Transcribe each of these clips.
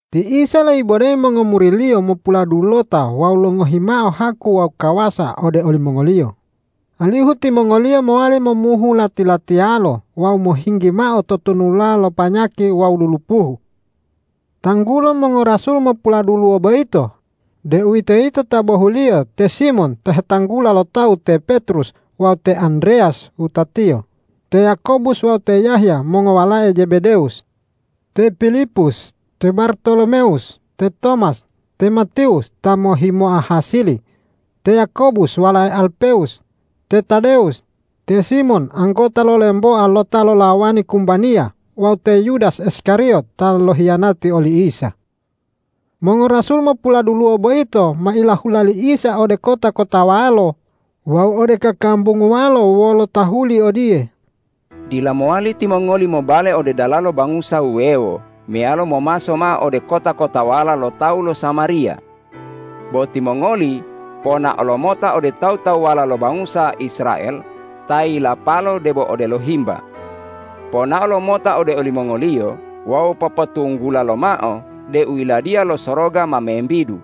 Ti Isa loibodeyi mongomuri-Liyo mopuladulota wawu longohi mao haku wawu kawasa ode olimongoliyo, alihu timongoliyo mowali momuhu lati-latiyalo wawu mohinggi mao totonulala panyaki wawu lulupuhu. Tanggulo mongorasul mopuladuluwo boyito, deuwitoyito ta bohuliyo te Simon ta hetanggula lo tawu te Petrus wawu te Andreyas wutatiyo, te Yakobus wawu te Yahya mongowalae Jebedewus, te Pilipus, te Bartolomewus, te Tomas, te Matiwus ta mohhimoa hasili, te Yakobus walae Alpewus, te Tadewus, te Simon anggota lo lemboa lo ta lolawani kumbaniya wawu te Yudas Iskariyot ta lohiyanati oli Isa. Mongorasul mopuladuluwo boyito ma ilahula li Isa ode kota-kotawalo wawu ode kakambunguwalo wolo tahuli odiye,”Dila mowali timongoli mobale ode dalalo bangusa wuwewo meyalo momaso mao ode kota-kotawala lo tawu lo Samariya. Bo timongoli ponao lomota ode tawu-tawuwala lo bangusa Israel ta yilapalo debo odelo himba. Ponao lomota ode olimongoliyo wawu popotunggula lomao deu Yiladiya lo Soroga ma membidu.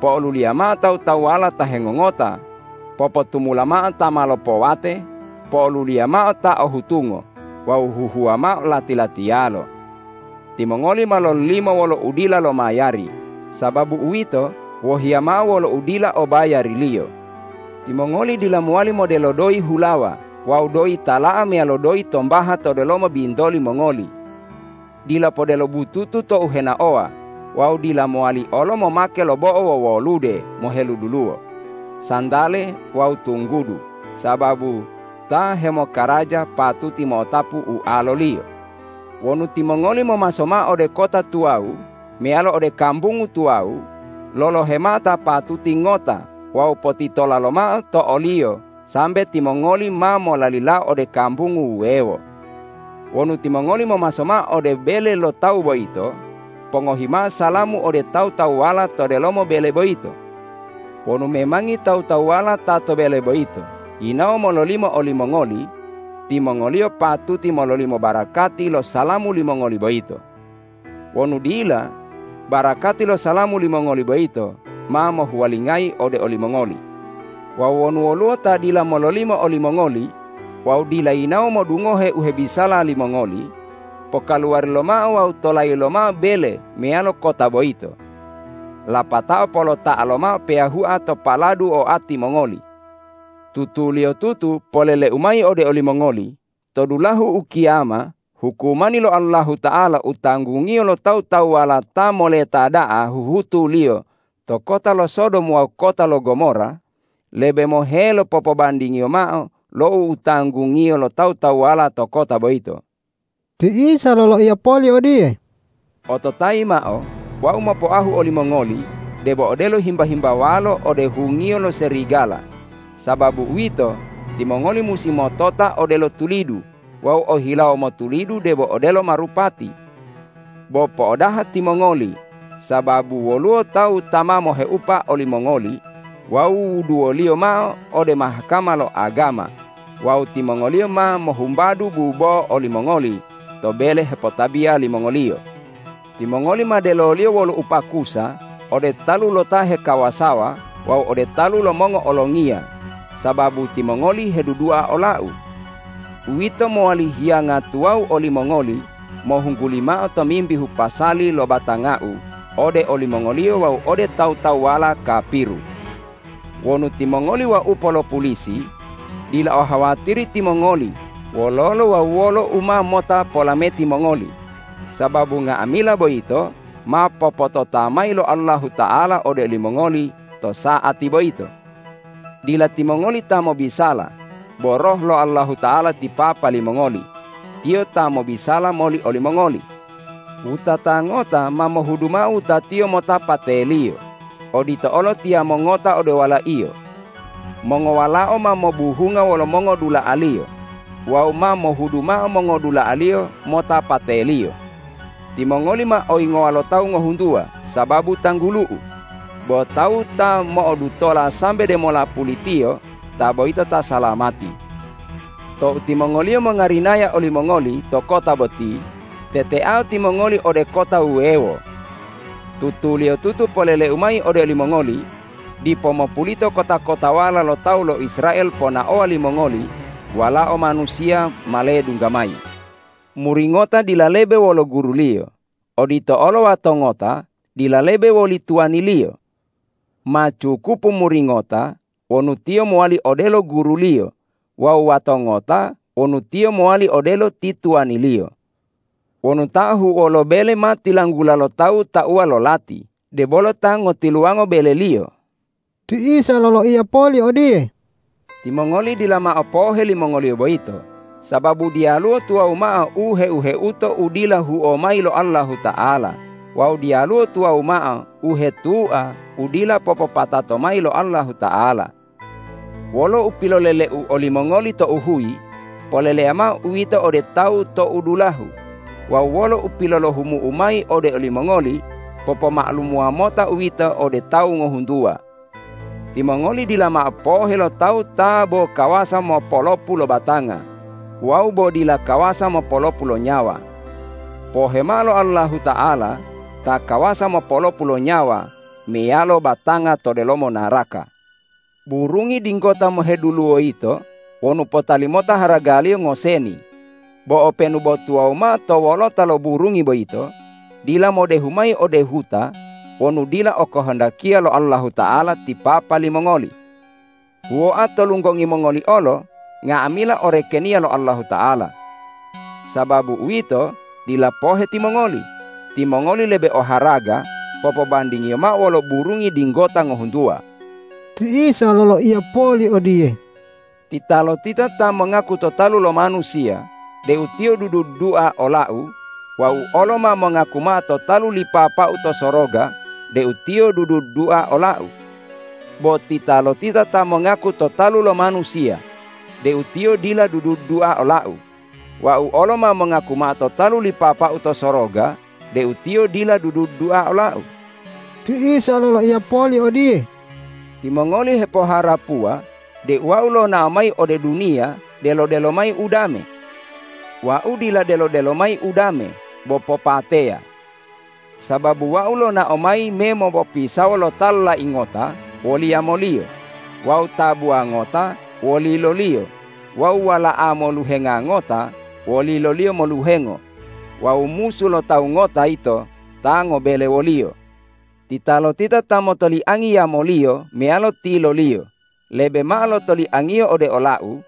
Po'oluliya mao tawu-tawuwala ta hengongota, popotumula mao ta ma lopowate, po'oluliya mao ta o hutungo wawu huhuwa mao lati-latiyalo. Timongoli ma lololimo wolo udila lomayari; sababu uwito, wohiya mao wolo udila obayariliyo. Timongoli dila mowali modelo doyi hulawa wawu doyi tala'a meyalo doyi tombaha to delomo bintoli mongoli. Dila podelo bututu tou henaowa wawu dila mowali olo momake lo bo'o wowolude moheduluwo, santale wawu tunggudu, sababu ta hemokaraja patuti mo'otapu ualoliyo. Wonu timongoli momaso mao ode kota tuwawu meyalo ode kambungu tuwawu, lolohe mao ta patuti ngota wawu potitola lomao to oliyo sambe timongoli ma molalilao ode kambungu wuwewo. Wonu timongoli momaso mao ode bele lo tawu boyito, pongohi mao salamu ode tawu-tawuwala to delomo bele boyito. Wonu memangi tawu-tawuwala ta to bele boyito yinawo mololimo olimongoli, timongoliyo patuti mololimo barakati lo salamu limongoli boyito. Wonu dila, barakati lo salamu limongoli boyito ma mohuwalingayi ode olimongoli. Wawu wonu woluwo ta dila mololimo olimongoli wawu dila yinawo modungohe u hebisala limongoli, pokaluwari lomao wawu tolayi lomao bele meyalo kota boyito. Lapatao polota'a lomao peyahua to paladu oati mongoli. Tutuliyotutu polele-U mayi ode olimongoli: To dulahu ukiyama hukumani lo Allahuta'ala u tanggungiyo lo tawu-tawuwala ta moleta da'a huhutuliyo to kota lo Sodom wawu kota lo Gomora lebe mohelo popobandingiyo mao lo u tanggungiyo lo tawu-tawuwala to kota boyito.” Ti Isa loloiya poli odiye,”Ototayi mao: Wau mopoahu olimongoli debo odelo himba-himbawalo ode hungiyo lo serigala. Sababu uwito, timongoli musi motota odelo tulidu wawu o hilawo motulidu debo odelo marupati. Bo po'odaha timongoli, sababu woluwo tawu ta ma moheupa olimongoli wawu wuduwoliyo mao ode Mahkama lo agama wawu timongoliyo ma mohumbadu bubo'o olimongoli to bele hepotabiya limongoliyo. Timongoli ma deloliyo wolo upakusa ode talu lo ta hekawasawa wawu ode talu lo mongo'olongiya sababu timongoli hedudua ola-U. Uwito mowali hiyanga tuwawu olimongoli mohungguli mao tomimbihu pasali lo batanga-U ode olimongoliyo wawu ode tawu-tawuwala kapiru. Wonu timongoli waupo lo pulisi, dila ohawatiri timongoli wololo wawu wolo u ma mota polameti mongoli, sababu nga'amila boyito ma popotota mayi lo Allahuta'ala ode olimongoli to sa'ati boyito. Dila timongoli ta mobisala bo Roh lo Allahuta'ala ti Papa limongoli. Tiyo ta mobisala moli olimongoli. Wutata ngota ma mohudu mao wutatiyo mota pateliyo, odito olo tiyamo ngota ode walaiyo. Mongowalao ma mobuhunga wolo mongodula'aliyo wawu ma mohudu mao mongodula'aliyo mota pateliyo. Timongoli ma oyingowa lo tawu ngohuntuwa sababu tanggulu-U, bo tawu ta mo'odutola sambe demola pulitiyo ta boyito ta salamati. Tou timongoliyo mongarinaya olimongoli to kota boti, teteao timongoli ode kota wuwewo. Tutuliyotutu polele-U mayi ode olimongoli: Dipo mopulito kota-kotawala lo tawu lo Israel ponaowa limongoli Walao Manusiya ma ledungga mayi. Muri ngota dila lebe wolo guruliyo; odito olo wato ngota dila lebe woli tuwaniliyo. Ma cukupu muri ngota wonu tiyo mowali odelo guruliyo wawu wato ngota wonu tiyo mowali odelo ti tuwaniliyo. Wonu ta ahu'uwo lo bele ma tilanggula lo tawu tauwa lo lati, debolo ta ngotiluwango beleliyo.” Ti Isa loloiya poli odiye,”Timongoli dila mao pohe limongoliyo boyito, sababu diyaluwo tuwawu mao u heu-heuto u dila huo mayi lo Allahuta'ala wawu diyaluwo tuwawu mao u hetua u dila popopatato mayi lo Allahuta'ala. Wolo u pilolele-U olimongoli tou huyi, poleleya mao uwito ode tawu tou dulahu; wawu wolo u pilolohumu-U mayi ode olimongoli, popoma'alumuwa mota uwito ode tawu ngohuntuwa. Timongoli dila mao pohe lo tawu ta bo kawasa mopolopu lo batanga wawu bo dila kawasa mopolopu lo nyawa. Pohe mao lo Allahuta'ala ta kawasa mopolopu lo nyawa meyalo batanga to delomo naraka. Burungi dinggota moheduluwo yito wonu potali mota haragaliyo ngoseni, bo openu bo tuwawu mao to wolota lo burungi boyito dila modehu mayi ode huta wonu dila okohondakiya lo Allahuta'ala ti Papa limongoli. Huwoa to lunggongi mongoli olo nga'amila o rekeniya lo Allahuta'ala. Sababu uwito, dila pohe timongoli: Timongoli lebe oharaga popobandingiyo mao wolo burungi dinggota ngohuntuwa.” Ti Isa loloiya poli odiye,”Titalotita ta mongaku to talu lo manusiya deu tiyo dudu-dudua ola-U, Wau olo ma mongaku mao to talu li Papa-U to soroga deu tiyo dudu-dudua ola-U. Bo titalotita ta mongaku to talu lo manusiya deu tiyo dila dudu-dudua ola-U, Wau olo ma mongaku mao to talu li Papa-U to soroga deu tiyo dila dudu-dudua ola-U.” Ti Isa loloiya poli odiye,”Timongoli hepoharapuwa deu Wau lonao mayi ode duniya delo-delo mayi udame. Wau dila delo-delo mayi udame bo popateya. Sababu Wau lonao mayi me mopopisawo lo ta lolai ngota woli yamoliyo, wawu tabuwa ngota woliloliyo wawu wala'a moluhenga ngota woliloliyo moluhengo wawu musu lo tawu ngota yito ta ngobele woliyo. Titalotita ta motoliangi yamoliyo meyalo tiloliyo lebe mao lo toliangiyo ode ola-U,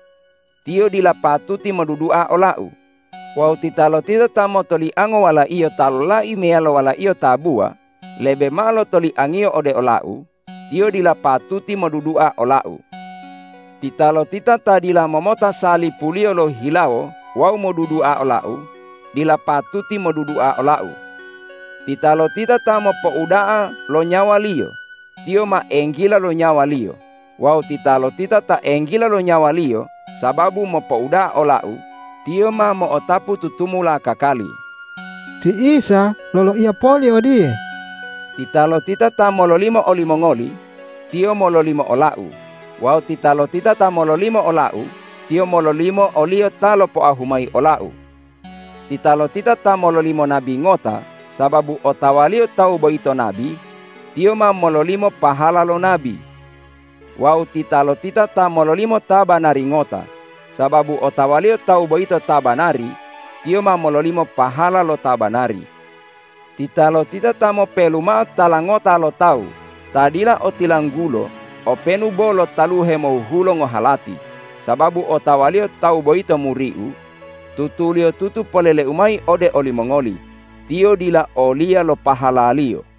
tiyo dila patuti modudua ola-U; wawu titalotita ta motoliango walaiyo ta lolai meyalo walaiyo tabuwa lebe mao lo toliangiyo ode ola-U, tiyo dila patuti modudua ola-U. Titalotita ta dila momota salipuliyo lohihilawo wawu modudua ola-U dila patuti modudua ola-U. Titalotita ta mopouda'a lo nyawaliyo, tiyo ma enggila lo nyawaliyo; wawu titalotita ta enggila lo nyawaliyo sababu mopouda'a ola-U, tiyo ma mo'otapu tutumula kakali.” Ti Isa loloiya poli odiye,”Titalotita ta mololimo olimongoli, tiyo mololimo ola-U. Wawu titalotita ta mololimo ola-U, tiyo mololimo o-Liyo ta lopoahu mayi ola-U. Titalotita ta mololimo nabi ngota sababu otawaliyo tawu boyito nabi, tiyo ma mololimo pahala lo nabi. Wawu titalotita ta mololimo ta banari ngota sababu otawaliyo tawu boyito ta banari, tiyo ma mololimo pahala lo ta banari. Titalotita ta mopelu mao tala ngota lo tawu ta dila otilanggulo openu bo lo taluhe mohuhulo ngohalati sababu otawaliyo tawu boyito muri-U, tutuliyotutu polele-U mayi ode olimongoli: Tiyo dila oliya lo pahalaliyo.”